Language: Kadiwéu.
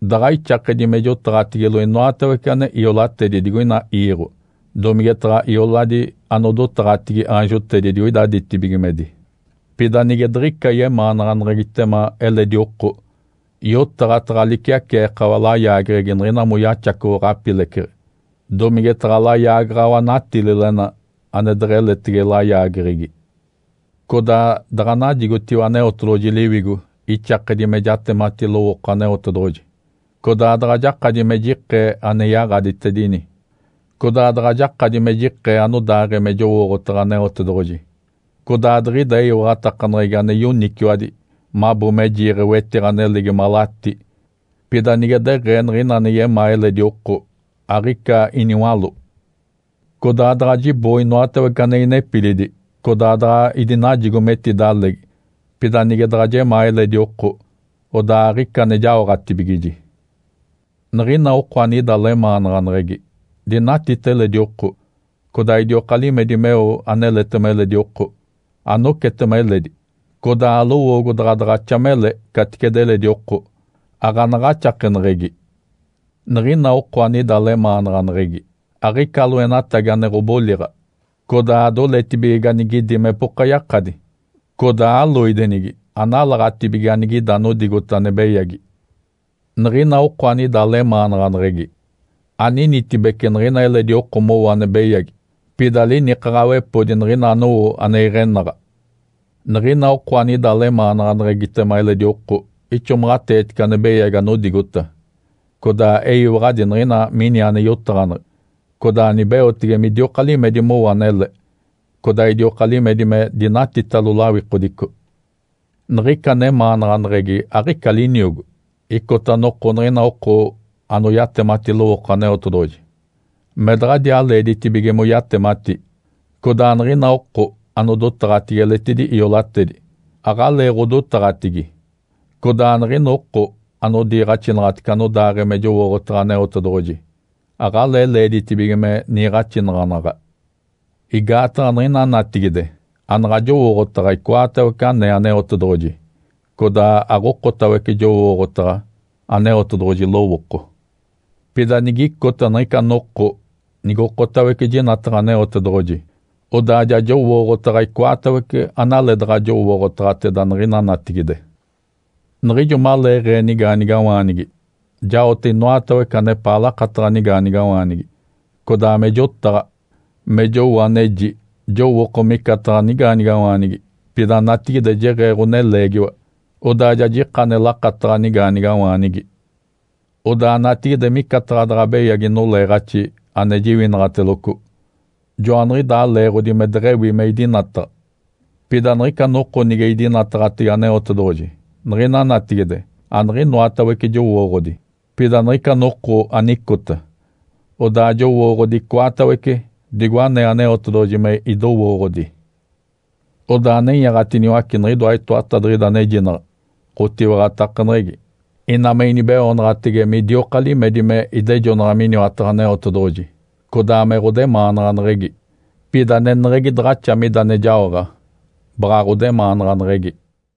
Daɡ̶a ixakedi me jotaɡ̶atigilo inoatawece ane iolatedi digoina iiɡ̶o domigetaɡ̶a ioladi anodotaɡ̶atigi aanjotedi digoida ditibigimedi, pida nige diɡ̶ica yemaanaɡ̶aneɡ̶egitema eledi oko, yotaɡ̶a taɡ̶a liciaceekawa layaageɡ̶egi niɡ̶ina moyaxacoɡ̶o ɡ̶apileceɡ̶e domigetaɡ̶a layaagaɡ̶awa natililena ane deɡ̶eletege layaageɡ̶egi. Codaa daɡ̶a najigotiwa Aneotedoɡ̶oji Liwigo ixakedi me jatemati lowooko Aneotedoɡ̶oji, codaa daɡ̶a jakadi me jikee ane yaɡ̶aditedini, codaa daɡ̶a jakadi me jikee anodaaɡ̶ee me jowooɡ̶otaɡ̶a Aneotedoɡ̶oji, codaa diɡ̶ida eyiwaɡ̶atakaneɡ̶egi ane yoniciwadi mabo me jiiɡ̶e wetiɡ̶a nelegi malatí, pida nige deɡ̶ee niɡ̶ina ane yemaa eledi oko, aɡ̶ica iniwaló. Codaa daɡ̶a jiboo inoatawece ane inepilidi, codaa daɡ̶a idinajigo metidalegi, pida nige daɡ̶a jemaa eledi oko, odaa aɡ̶ica ane jaoɡ̶atibigiji. Niɡ̶ina oko anida lemaanaɡ̶aneɡ̶egi, dinatita eledi oko, codaa idioka limedi meo aneletema eledi oko. Anocetema eledi, codaa alowoogo daɡ̶a daɡ̶axa mele caticedi eledi oko, aɡ̶anaɡ̶axakeneɡ̶egi. Niɡ̶ina oko anida lemaanaɡ̶aneɡ̶egi, aɡ̶ica loenatagi ane ɡ̶oboliɡ̶a, codaa adoletibige ganigidi mepoka yakadi. Codaa aloidenigi, analaɡ̶atibige anigida anodigota ane beyagi. Niɡ̶ina oko anida lemaanaɡ̶aneɡ̶egi, aninitibece niɡ̶ina eledi oko mowo ane beyagi, pida linikaɡ̶awepodi niɡ̶ina anowo ane iɡ̶enaɡ̶a. Niɡ̶ina oko anida lemaanaɡ̶aneɡ̶egitema eledi oko ixomaɡ̶ateetice ane beyagi anodigota, codaa eyiwaɡ̶adi niɡ̶ina mini ane yotaɡ̶aneɡ̶e, codaa nibeotege midioka limedi mowo anele, codaa idioka limedi me dinatitalo lawikodico. Niɡ̶ica nemaanaɡ̶aneɡ̶egi aɡ̶ica liniogo. Icota noko niɡ̶ina oko anoyatemati lowooko Aneotedoɡ̶oji, me daɡ̶adiaa leeditibige moyatemati, codaa niɡ̶ina oko anodotaɡ̶atigi eletidi iolatedi, aɡ̶aleeɡ̶odotaɡ̶atigi, codaa niɡ̶ina oko anodiiɡ̶axinaɡ̶atece anodaaɡ̶ee me jowooɡ̶otaɡ̶a Aneotedoɡ̶oji aɡ̶alee leeditibige me niiɡ̶axinaɡ̶anaɡ̶a. Igaataɡ̶a niɡ̶ina natigide anaɡ̶a jowooɡ̶otaɡ̶a icoatawece anee Aneotedoɡ̶oji, codaa aɡ̶okotawece jowooɡ̶otaɡ̶a Aneotedoɡ̶oji lowooko. Pida nigicota niɡ̶ica noko nigokotawece jinataɡ̶a Aneotedoɡ̶oji, odaa ja jowooɡ̶otaɡ̶a icoatawece analeedaɡ̶a jowooɡ̶otaɡ̶ateda niɡ̶ina natigide. Niɡ̶ijo maleeɡ̶ee nigaanigawaanigi, jaote inoatawece anepaa lakataɡ̶a nigaanigawaanigi. Codaa me jotaɡ̶a, me jowo aneji, jowooko micataɡ̶a nigaanigawaanigi. Pida natigide jeɡ̶ee ɡ̶oneleegiwa, odaa ja jika ane lakataɡ̶a nigaanigawaanigi. Odaa natigide micataɡ̶a daɡ̶a beyagi noleeɡ̶axi ane jiwinaɡ̶ateloco, joaniɡ̶idaa leeɡ̶odi me deɡ̶ewi me idinataɡ̶a. Pida niɡ̶ica noko nige idinataɡ̶atege Aneotedoɡ̶oji. Niɡ̶ina natigide aniɡ̶inoatawece jowooɡ̶odi, pida niɡ̶ica noko anicota, odaa jowooɡ̶odi icoatawece, digo anee Aneotedoɡ̶oji me idowooɡ̶odi. Odaa nenyaɡ̶atiniwace niɡ̶idoa itoatadiɡ̶ida anejinaɡ̶a: Ǥotiwaɡ̶atakaneɡ̶egi, ina me inibeoonaɡ̶atege midioka limedi me idejonaɡ̶a miniwataɡ̶a Aneotedoɡ̶oji, codaa me ɡ̶odemaanaɡ̶aneɡ̶egi. Pida aneneɡ̶egi daɡ̶axa mida ane jaoɡ̶a, baɡ̶a ɡ̶odemaanaɡ̶aneɡ̶egi.